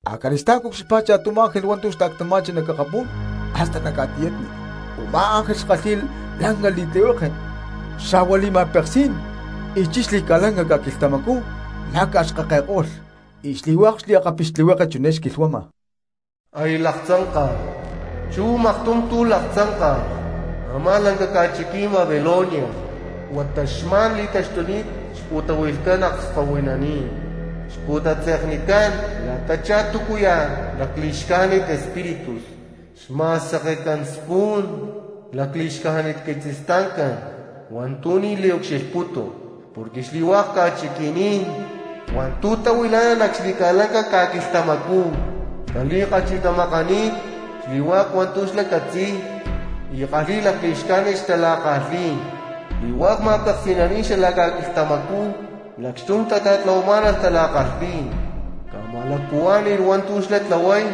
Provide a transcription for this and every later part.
Acali̠stá̠n cucxilhpá cha̠tum ángel hua̠nti̠ xta̠ctama̠chi nac akapú̠n hasta nac ca̠tiyatni; u̠má ángel xkalhi̠y lanca li̠tlihueke xa̠hua li̠ma̠peksí̠n, y chilh xli̠ca̠lanca ca̠quilhtamacú macaxkakeko̠lh acxni̠. Y xli̠hua̠k xliakapixtlihueke chiné xquilhuama: ¡Aya laktzánka̠lh! ¡Chú maktum tu̠ laktzánka̠lh a̠má lanca ca̠chiquí̠n Babilonia! ¡Huata xma̠n li̠taxtuni̠t xpu̠tahui̠lhcán akskahuininí̠n, xpu̠tatze̠knicán la̠tachá túcuya̠ lacli̠xcájnit espíritus, xma̠sekecán spun lacli̠xcájnit quitzistancán hua̠ntu̠ ni̠ liucxilhputu! Porque xli̠hua̠k ca̠chiqui̠ní̠n hua̠ntu̠ tahuilá̠nalh nac xli̠ca̠lanca ca̠quilhtamacú tali̠kachi̠tamakani̠t xli̠hua̠k hua̠ntu̠ xlá catzi̠y y kalhi̠y lacli̠xcájnit xtala̠kalhí̠n; xli̠hua̠k ma̠peksi̠naní̠n xalac ca̠quilhtamacú lacxtum tata̠tláhualh tala̠kalhí̠n, ca̠ma̠lacpuhuá̠ni̠lh hua̠ntu̠ xlá tlahuay;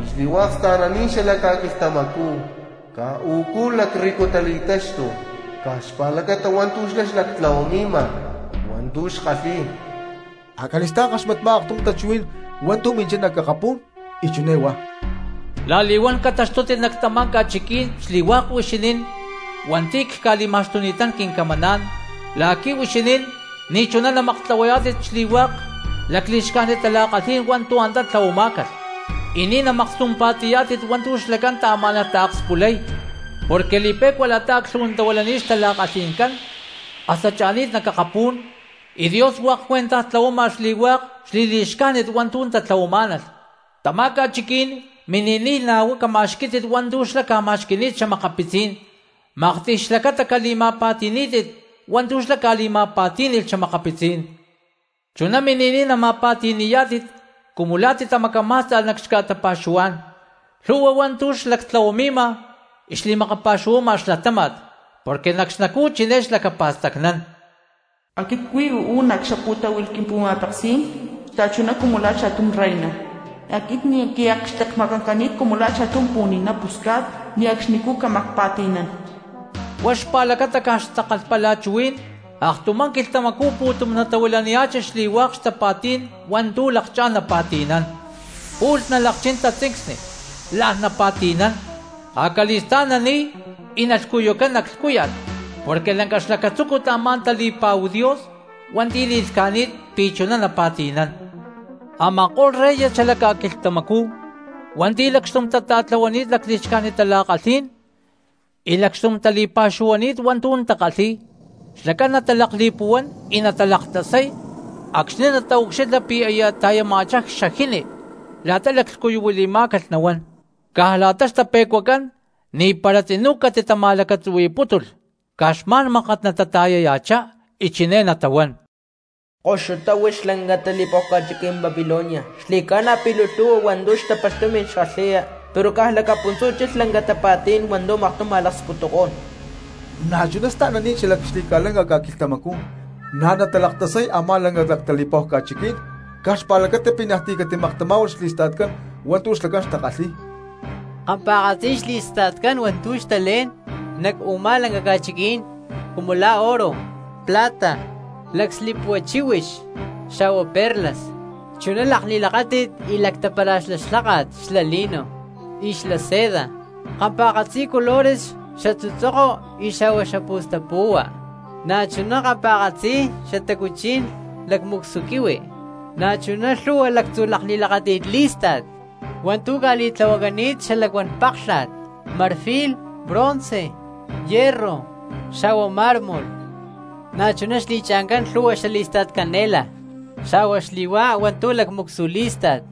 y xli̠hua̠k sta̠naní̠n xalac ca̠quilhtamacú caj u̠cú lacrrico tali̠táxtulh caj xpa̠lacata hua̠ntu̠ xlá xlactlahuami̠ma hua̠ntu̠ xkalhi̠y. Acali̠stá̠n ckaxmatpá aktum tachuhuí̠n hua̠ntu̠ minchá nac akapú̠n y chiné huá: La̠li̠huán cataxtútit nac tamá ca̠chiquí̠n xli̠hua̠k huixinín hua̠nti̠ cca̠li̠ma̠xtuni̠tán quincamaná̠n, la̠qui̠ huixinín ni̠ chuná namaktlahuayá̠tit xli̠hua̠k lacli̠xcájnit tala̠kalhí̠n hua̠ntu̠ antá tlahuamá̠calh, y ni̠ namakstumpa̠ti̠yá̠tit hua̠ntu̠ xlacán taamá̠nalh taakspulay. Porque li̠pe̠cua la̠ta aclhu̠huantahuilani̠t xtala̠kalhi̠ncán hasta cha̠ni̠t nac akapú̠n, y Dios hua̠k cuentaj tlahuama xli̠hua̠k hua̠ntu̠ xli̠li̠xcájnit hua̠ntu̠ tatlahuamá̠nalh. Tamá ca̠chiquí̠n mini̠niy na̠ huá cama̠xquí̠tit hua̠ntu̠ xlá ca̠ma̠xqui̠ni̠t xa̠makapitzí̠n, maktiy xlacata cali̠ma̠pa̠ti̠ní̠tit hua̠ntu̠ xlá ca̠li̠ma̠pa̠tí̠ni̠lh xa̠makapitzí̠n. Chuná mini̠niy nama̠pa̠ti̠ni̠yá̠tit cumu la̠ titamacamá̠sta̠lh nac xca̠tapa̠xuhuá̠n lhu̠hua hua̠ntu̠ xlactlahuami̠ma y xli̠makapa̠xuhuama xlatáma̠t. Porque nac xnacú chiné xlacapa̠stacnán: “Aquit cuí uú nac xapu̠táhui̠lh quimpu̠ma̠peksí̠n xta̠chuná cumu la̠ cha̠tum reina. Aquit ni̠ quiakxtekmakancani̠t cumu la̠ cha̠tum pu̠ni̠ná pusca̠t, ti̠ li̠wamaj ne̠cxnicú cámaj pa̠ti̠nán.” Huá xpa̠lacata caj xtakalhpalachuhuí̠n aktumá quilhtamacú pu̠tum natahuilaniya̠chi xli̠hua̠k xtapa̠tí̠n hua̠ntu̠ lakchá̠n napa̠ti̠nán: pu̠lh nalakchín tatzincsni, la̠n napa̠ti̠nán, acali̠stá̠n nani̠y, y nalhcuyucán nac lhcúya̠t. Porque lanca xlacatzúcut a̠má tali̠pa̠hu Dios hua̠nti̠ li̠lhca̠ni̠t pi̠ chuná napa̠ti̠nán. Ama̠ko̠lh reyes xalac ca̠quilhtamacú hua̠nti̠ lacxtum tata̠tlahuani̠t lacli̠xcájnit tala̠kalhí̠n, y lacxtum tali̠pa̠xuhuani̠t hua̠ntu̠ takalhi̠y, xlacán natalakli̠puhuán y natalaktasay acxni̠ nataucxilha pi̠ aya ta̠yama̠chá xajini la̠ta laclhcuyuhuili̠má̠calh nahuán. Caj la̠ta xtape̠cuacán ni̠para tzinú catitama̠lacatzuhui̠pútulh, caj xma̠n mákat natata̠yaya̠chá y chiné natahuán: ¡Koxutá huix lanca tali̠pa̠hu ca̠chiquí̠n Babilonia, xli̠ca̠na pi̠ luu lhu̠hua hua̠ntu̠ xtapalh tumi̠n xkalhi̠ya! Pero caj puntzú chilh lanca tapa̠tí̠n hua̠ntu̠ maktum ma̠laksputukó̠n. Na̠chuná sta̠naní̠n xalac xli̠ca̠lanca ca̠quilhtamacú na̠ natalaktasay a̠má lanca tali̠pa̠hu ca̠chiquí̠n caj xpa̠lacata pi̠ niaj ti̠ catimaktamá̠hualh xli̠sta̠tcán hua̠ntu̠ xlacán takalhi̠y. Kampa̠katzi xli̠sta̠tcán hua̠ntu̠ xtalé̠n nac u̠má lanca ca̠chiquí̠n, cumu la̠ oro, plata, lacslipua chíhuix xa̠hua perlas, chuná lakli̠lakáti̠t y lactapara̠xlá lháka̠t xla lino y xla seda, kampa̠katzi colores xatzutzoko xa̠hua xapu̠stapu̠hua, na̠chuná kampa̠katzi xatacuchí̠n lacmu̠csu quihui; na̠chuná lhu̠hua lactzu lakli̠lakáti̠t lí̠sta̠t hua̠ntu̠ ca̠li̠tlahuacani̠t xalacuán páklha̠t, marfil, bronce, hierro, xa̠hua mármol. Na̠chuná xli̠cha̠ncán lhu̠hua xalí̠sta̠t canela, xa̠hua xli̠hua̠k hua̠ntu̠ lacmu̠csu lí̠sta̠t,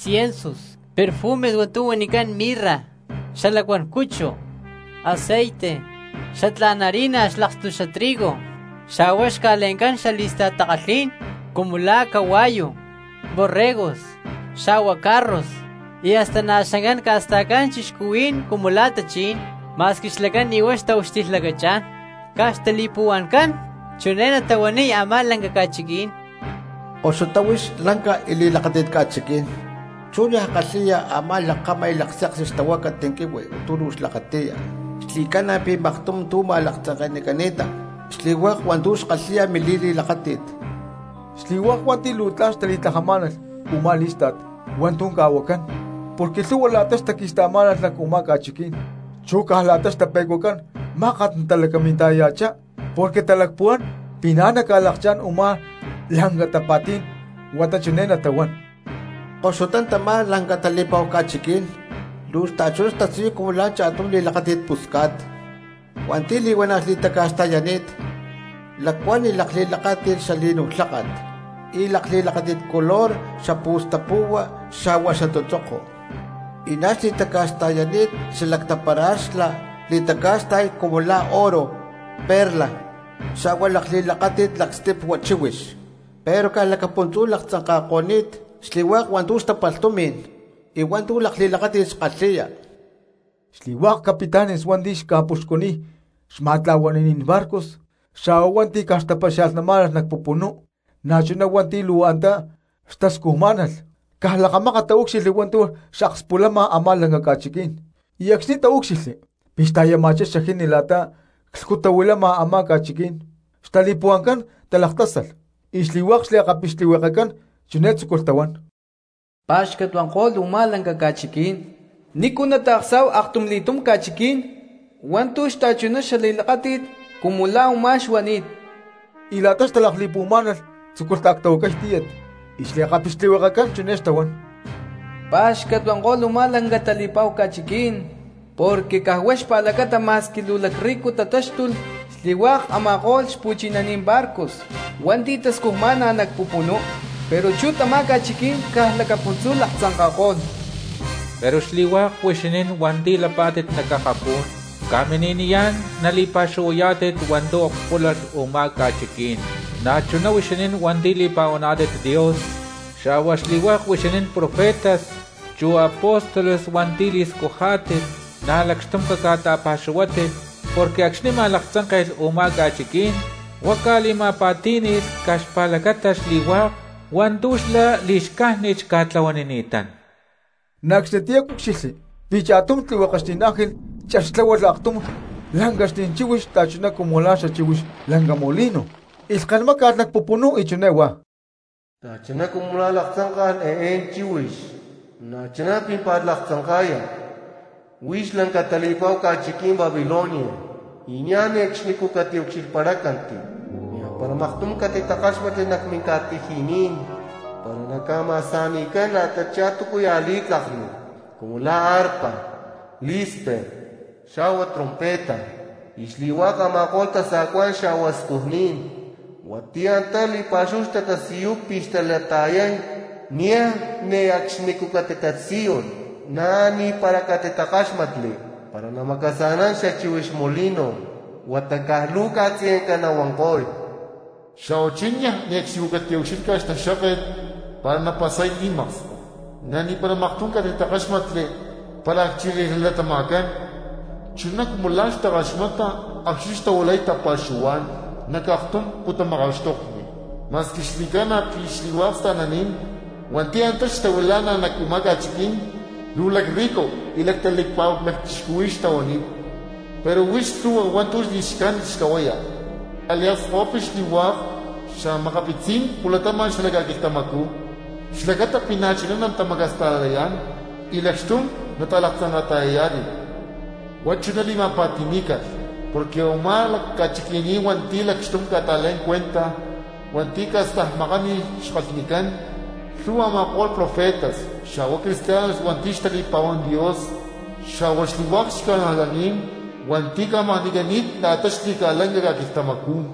ciensus, perfumes hua̠ntu̠ huanicán mirra; xalacuán cuchu, aceite, xatlá̠n harina xlakstu xla trigo, xa̠hua xca̠le̠ncán xalí̠sta̠t takalhí̠n cumu la̠ cahua̠yu, borregos, xa̠hua carros, y hasta na̠ xancán ca̠sta̠cán cristianos cumu la̠ tachí̠n, ma̠squi xlacán ni̠ huá xataucxilhlacachá̠n. Caj xtali̠puhua̠ncán chiné natahuaniy a̠má lanca ca̠chiquí̠n: ¡Koxutá huix lanca y li̠lakáti̠t ca̠chiquí̠n, chú niaj kalhi̠ya a̠má lakkama y lakseksi xtahuácat quihui hua̠ntu̠ huix luu xlakati̠ya! Xli̠cána pi̠ maktum tu̠ ma̠laktzanke̠nicani̠ta xli̠hua̠k hua̠ntu̠ xkalhi̠ya mili̠li̠lakáti̠t. Xli̠hua̠k hua̠nti̠ luu tla̠n xtali̠tlajamá̠nalh u̠má lí̠sta̠t hua̠ntu̠ ca̠huacán, porque lhu̠hua la̠ta xtaqui̠sta̠má̠nalh nac u̠má ca̠chiquí̠n, chu caj la̠ta xtape̠cuacán mákat natalacaminta̠yaya̠chá porque talacpuhuán pi̠ na̠ naca̠lakchá̠n u̠má lanca tapa̠tí̠n, huata chiné natahuán: ¡Koxutá tamá lanca tali̠pa̠hu ca̠chiquí̠n! Luu xta̠chuná xtasiyuy cumu la̠ cha̠tum li̠lakáti̠t pusca̠t hua̠nti̠ li̠huana̠ xli̠taca̠xta̠yani̠t lacuán y lakli̠lakáti̠t xalino lháka̠t. y lakli̠lakáti̠t color xapu̠stapu̠hua xa̠hua xatzutzoko, y na̠ xli̠taca̠xta̠yani̠t xalactapara̠xlá xli̠taca̠xta̠y cumu la̠ oro, perlas, xa̠hua lakli̠lakáti̠t lacslipua chíhuix. ¡Pero caj lacapuntzú laktzanka̠ko̠ni̠t xli̠hua̠k hua̠ntu̠ xtapalh tumi̠n y hua̠ntu̠ lakli̠lakáti̠t xkalhi̠ya! Xli̠hua̠k capitanes hua̠nti̠ xca̠puxcuniy xma̠tla̠huani̠naní̠n barcos, xa̠hua hua̠nti̠ caj xtapaxia̠lhnamá̠nalh nac pupunú, na̠chuná hua̠nti̠ luu antá xtascujmá̠nalh, caj lakamákat taúcxilhli hua̠ntu̠ xakspulama a̠má lanca ca̠chiquí̠n, y acxni̠ taúcxilhli pi̠ xta̠yama̠chá xajini la̠ta clhcutahuilama a̠má ca̠chiquí̠n xtali̠puhua̠ncán talaktásalh y xli̠hua̠k xliakapixtlihuekecán chiné tzúculh tahuán: —Pá̠xcat huanko̠lh u̠má lanca ca̠chiquí̠n, ¿nícu nata̠ksa̠hu aktumli̠túm ca̠chiquí̠n hua̠ntu̠ xta̠chuná xali̠lakáti̠t cumu la̠ u̠má xuani̠t? Y la̠ta xtalakli̠puhuamá̠nalh tzúculh taactahuacay tíyat y xli̠pixtlihuekecán chiné xtahuán: ¡Pa̠xcat huanko̠lh u̠má lanca tali̠pa̠hu ca̠chiquí̠n! Porque caj huá xpa̠lacata ma̠squi luu lacrrico tatáxtulh xli̠hua̠k a̠ma̠ko̠lh xpu̠chinaní̠n barcos hua̠nti̠ tascujmá̠nalh nac pupunú. ¡Pero chú tamá ca̠chiquí̠n caj lacapuntzú laktzanka̠ko̠lh! Pero xli̠hua̠k huixinín hua̠nti̠ lapá̠tit nac akapú̠n, ca̠mini̠niyá̠n nali̠pa̠xuhuayá̠tit hua̠ntu̠ akspúlalh u̠má ca̠chiquí̠n; na̠chuná huixinín hua̠nti̠ li̠pa̠huaná̠tit Dios, xa̠hua xli̠hua̠k huixinín profetas chu apóstoles hua̠nti̠ li̠scujá̠tit, na̠ lacxtum caca̠ta̠pa̠xuhuátit, porque acxni̠ ma̠laktzánke̠lh u̠má ca̠chiquí̠n huá ca̠li̠ma̠pa̠tí̠ni̠lh caj xpa̠lacata xli̠hua̠k hua̠ntu̠ xlá li̠xcájnit xca̠tlahuanini̠tán. Na̠ acxnitiyá cúcxilhli pi̠ cha̠tum tlihuekexní̠n ángel chextláhualh aktum lancaxní̠n chíhuix xta̠chuná cumu la̠ xachíhuix lanca molino, y lhkén máca̠lh nac pupunú, y chiné huá: Xta̠chuná cumu la̠ laktzanka̠lh eé chíhuix na̠chuná pímpa̠t laktzanka̠ya huix lanca tali̠pa̠hu ca̠chiquí̠n Babilonia, y niaj ne̠cxnicú catiucxilhparácanti. Ni̠aj para maktum catitakáxmatli nac minca̠tiji̠ní̠n para naca̠ma̠sa̠ni̠cán la̠tachá túcuya̠ li̠tlakni cumu la̠ arpa, lí̠spek xa̠hua trompeta, y xli̠hua̠k a̠ma̠ko̠lh tasa̠cuá̠n xa̠hua scujní̠n hua̠nti̠ antá li̠pa̠xúhu xtatasiyuy pi̠ xtalata̠yay niaj ne̠cxnicú catitatasíyulh, na̠ ni̠para catitakáxmatli para namacasa̠nán xachíhuix molino, huata caj luu ca̠tzayanca nahuanko̠y. Xa̠huachí niaj ne̠cxnicú catiucxílhcalh xtaxkáket para napasay li̠maksko, na̠ ni̠para maktum catitakáxmatli para acchilij nalatama̠cán chuná cumu la̠ xtakaxmata acxni̠ xtahuilay tapa̠xuhuá̠n nac aktum pu̠tamakaxtokni, ma̠squi xli̠ca̠na pi̠ xli̠hua̠k sta̠naní̠n hua̠nti̠ antá xtahuilá̠nalh nac u̠má ca̠chiquí̠n luu lacrrico y lactali̠pa̠hua lacchixcuhuí̠n xtahuani̠t, pero huix lhu̠hua hua̠ntu̠ li̠xcájnit xtlahuaya, ca̠liakskahuipi xli̠hua̠k xa̠makapitzí̠n pu̠latama̠n xalac ca̠quilhtamacú xlacata na̠chuná natamacasta̠layá̠n y lacxtum nalaktzanka̠yá̠tit. Huá chuná li̠ma̠pa̠ti̠ní̠calh porque u̠má ca̠chiquí̠n hua̠nti̠ lacxtum ca̠ta̠lé̠n cuentaj hua̠nti̠ ca̠stajmakani̠t xkalhnicán lhu̠hua a̠ma̠ko̠lh profetas, xa̠hua cristianos hua̠nti̠ xtali̠pa̠huán Dios, xa̠hua xli̠hua̠k xca̠najlaní̠n hua̠nti̠ ca̠makni̠cani̠t la̠ta xli̠ca̠lanca ca̠quilhtamacú.